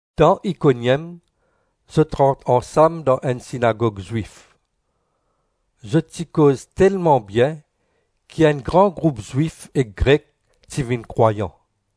Dan Ikoniem, zot rant ansam dan enn sinagog Zwif. Zot ti koz telman bien ki enn gran group Zwif ek Grek ti vinn krwayan.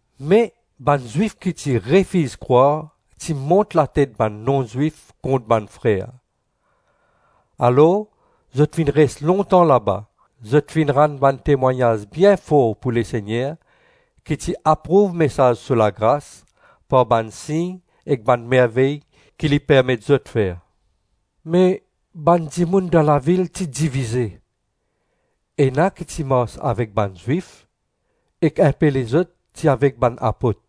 Me bann Zwif ki ti refiz krwar ti mont latet bann non-Zwif kont bann frer. Alors zot finn res lontan laba, zot finn rann bann temwagnaz bien for pou Lesegner ki ti aprouv mesaz so lagras par bann sign ek bann mervey ki li permet zot fer. Me bann dimoun dan lavil ti divize: ena ki ti mars avek bann Zwif, ek inpe lezot ti avek bann apot.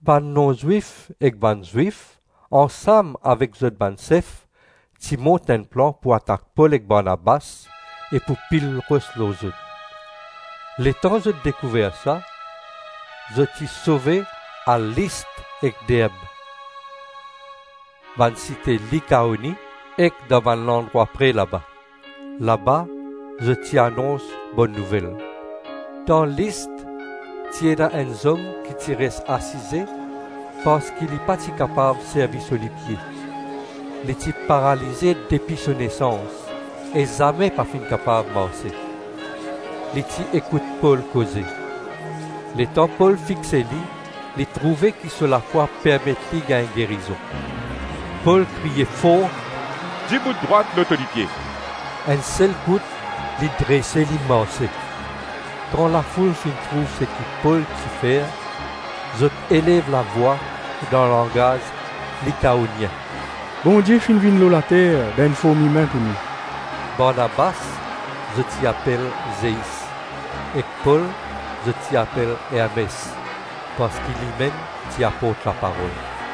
Bann non-Zwif ek bann Zwif ansam avek zot bann sef ti mont enn plan pou atak Pol ek Barnabas ek pou pil ros lor zot; letan zot dekouver sa, zot ti sove al List ek Derb, bann site Likaoni, ek dan bann landrwa pre laba. Laba zot ti anons Bonn Nouvel. Dan List ti ena enn zom ki ti res asize parski li pa ti kapav servi so lipie; li ti paralize depi so nesans, e zame pa finn kapav marse. Li ti ekout Pol koze. Letan Pol fixe li, li trouve ki so lafwa permet li gagn gerizon. Pol kriye for, “Dibout drwat lor to lipie.” Enn sel kout li drese, li marse. Kan lafoul finn trouv seki Pol ti fer, zot elev lavwa, dan langaz Likaonien, “Bondie finn vinn lor later dan enn form imin pou nou!” Barnabas, zot ti apel Zeis ek Pol, zot ti apel Ermes parski limem ti aport laparol.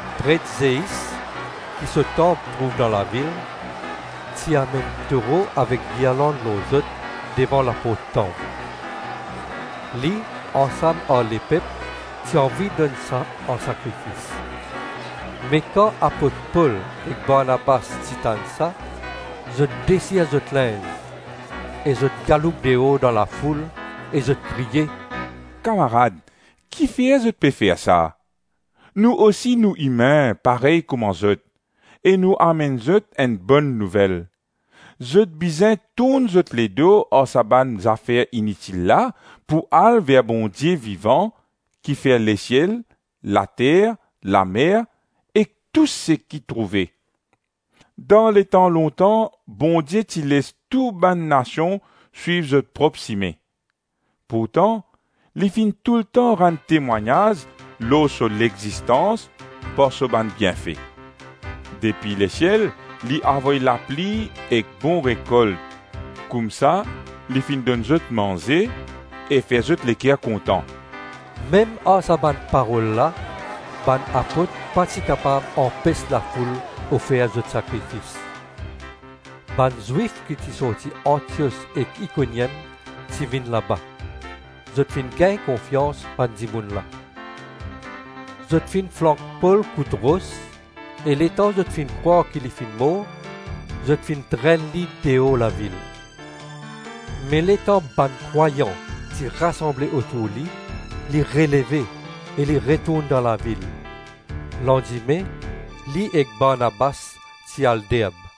Pret Zeis, ki so tanp trouv dan lavil, ti amenn toro avek girland lor zot devan laport tanp; li, ansam ar lepep ti anvi donn sa ansakrifis. Me kan apot Pol ek Barnabas ti tann sa, zot desir zot linz ek zot galoup deor dan lafoul, e zot kriye, “Kamarad, kifer zot pe fer sa? Nou osi nou imin, parey kouma zot, e nou amenn zot enn Bonn Nouvel: zot bizin tourn zot ledo ar sa bann zafer initil la, pou al ver Bondie vivan ki fer lesiel, later, lamer ek tou seki trouve. Dan letan lontan Bondie ti les tou bann nasion swiv zot prop sime, pourtan li finn toultan rann temwagnaz lor so lexistans par so bann bienfe. Depi lesiel li avoy lapli ek bon rekolt, koumsa li finn donn zot manze e fer zot leker kontan.” Mem ar sa bann parol la bann apot pa ti kapav anpes lafoul ofer zot sakrifis. Bann Zwif ki ti sorti Antios ek Ikoniem ti vinn laba. Zot finn gagn konfians bann dimoun la. Zot finn flank Pol kout ros, e letan zot finn krwar ki li finn mor, zot finn trenn li deor lavil. Me letan bann krwayan ti rasanble otour li, li releve e li retourn dan lavil. Landime li ek Barnabas ti al Derb.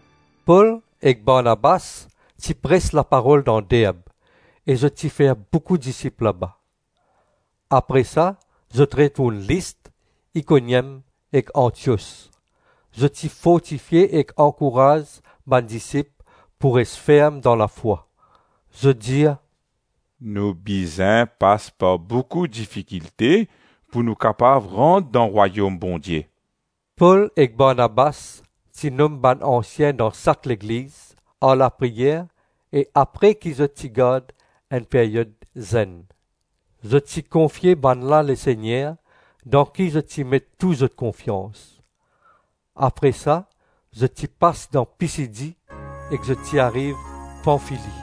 Pol ek Barnabas ti pres laparol dan Derb e zot ti fer boukou disip laba. Apre sa zot retourn List, Ikoniem ek Antios. Zot ti fortifie ek ankouraz bann disip pou res ferm dan lafwa. Zot dir, “Nou bizin pas par boukou difikilte pou nou kapav rant dan Rwayom Bondie.” Pol ek Barnabas ti nom bann ansien dan sak legliz, ar lapriyer e apre ki zot ti gard enn peryod zenn; zot ti konfie bannla Lesegner, dan ki zot ti met tou zot konfians. Apre sa zot ti pas dan Pisidi e zot ti ariv Panfili.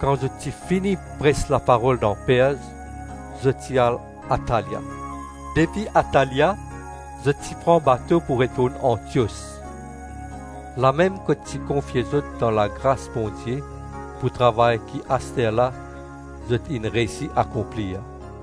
Kan zot ti fini pres laparol dan Perz, zot ti al Atalia. Depi Atalia zot ti pran bato pou retourn Antios, lamem kot ti konfie zot dan lagras Bondie pou travay ki asterla zot inn reysi akonplir.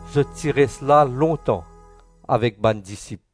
Zot ti res la lontan avek bann disip.